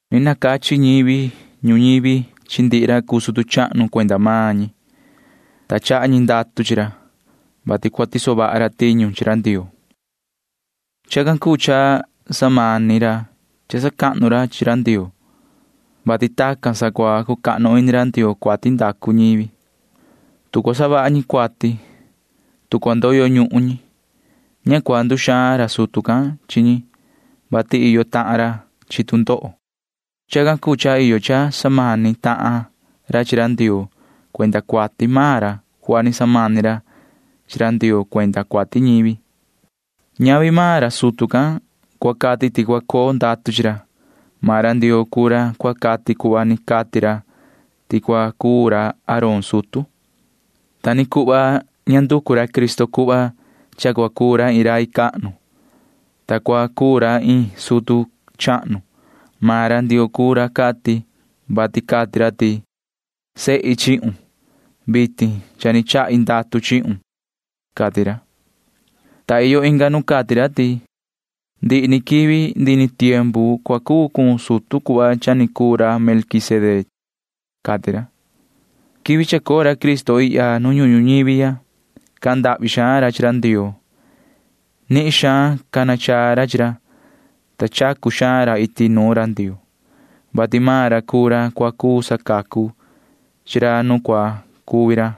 Ni nacachi ñivi ñuñivi chi ndihi ra cuu sutu chahnu cuenda maan ñi, ta chaha ñi ndatu chi ra, vati cua tiso vaha ra tiñu chi ra Ndioo. Chacan cuu cha samani ra cha sacahnu ra chi ra Ndioo, vati tacan sa cua cucahnu ini ra Ndioo cuati ndacu ñivi. Tu cua savaha ñi cuati, tu cua ndoyo ñuhun ñi, ña cua nduxaan ra sutu can chi ñi, vati iyo tahan ra chi tu ndoho. Chacan cuu cha iyo cha samani tahan ra chi ra Ndioo cuenda cuati maan ra cuhva ni samani ra chi Ndioo cuenda cuati ñivi. Ñavi maan ra sutu can cua cati ti cua coo ndatu chi ra. Maan ra Ndioo cuu ra cua cati cuhva ni cati ra ti cua cuu ra Aarón sutu. Ta ni cuhva ña nducu ra Cristo cuhva cha cua cuu ra iin rai cahnu, ta cua cuu ra iin sutu chahnu. Maan ra Ndioo cuu ra cati, vati cati ra ti: Sehi chihun. Vitin cha ni chahi ndatu chihun, cati ra, ta iyo inga nu cati ra ti: Ndihi ni quivi ndihi ni tiempu cua cuu cun sutu cuhva cha ni cuu ra Melquisedec, cati ra. Quivi chacoo ra Cristo ihya nu ñuhun ñuñivi ya, cahan ndahvi xaan ra chi ra Ndioo. Nihin xaan cana chaa ra chi ra, ta chacu xaan ra iti nuun ra Ndioo, vati maan ra cuu ra cua cuu sacacu chi ra nu cua cuvi ra.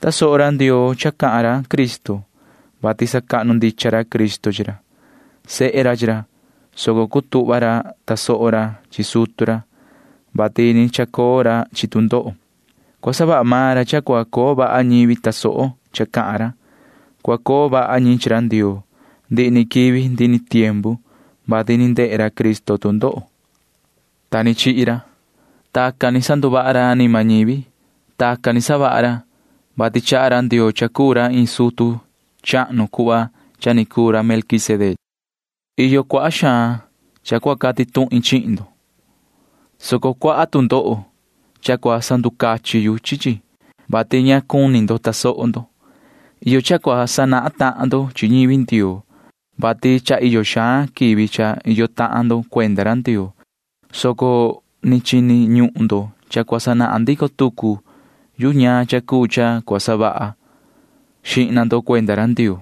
Tasoho ra Ndioo cha cahan ra Cristo, vati sacahnu ndicha ra Cristo chi ra. Sehe ra chi ra, soco cutuhva ra tasoho ra chi sutu ra, vati ni chacoo ra chi tu ndoho. Cua savaha maan ra cha cua coo vaha ñivi tasoho cha cahan ra. Cua coo vaha ñi chi ra Ndioo ndihi ni quivi ndihi ni tiempu, vati ni ndehe ra Cristo tu ndoho, ta ni chihi ra. Tacan ni sanduvaha ra anima ñivi. Tacan ni savaha ra, vati chaha ra Ndioo cha cuu ra iin sutu chahnu cuhva cha ni cuu ra Melquisedec. Iyo cuaha xaan cha cua cati tuhin chihin ndo, soco cuaha tu ndoho cha cua sanducachin yu chi chi, vati ña cuni ndo tasoho ndo. Iyo cha cua sanahan tahan ndo chi ñivi Ndioo, vati cha iyo xaan quivi cha iyo tahan ndo cuenda ra Ndioo, soco ni chini ñuhun ndo cha cua sanahan ndico tucu yu ñaan cha cuu cha cua savaha xihna ndo cuenda ra Ndioo.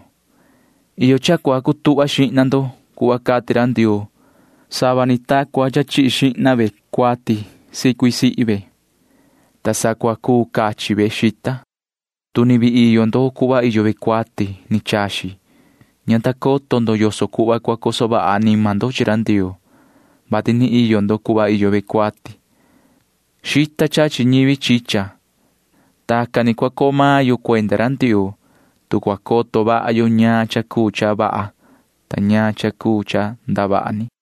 Iyo cha cua cutuhva xihna ndo cuhva cati ra Ndioo sava ni ta cua chihi xihna ve cuati sicui sihi ve, ta sa cua cuu cachi ve xita. Tu ni vii iyo ndo cuhva iyo ve cuati ni chaxi, ña ta coto ndo yoso cuhva cua coso vaha anima ndo chi ra Ndioo, vati ni iyo ndo cuhva iyo ve cuati. Xita chachi ñivi chicha. Tacan ni cua coo maan yo cuenda ra Ndioo, tu cua coto vaha yo ñaan cha cuu cha vaha ta ñaan cha cuu cha ndavaha ni.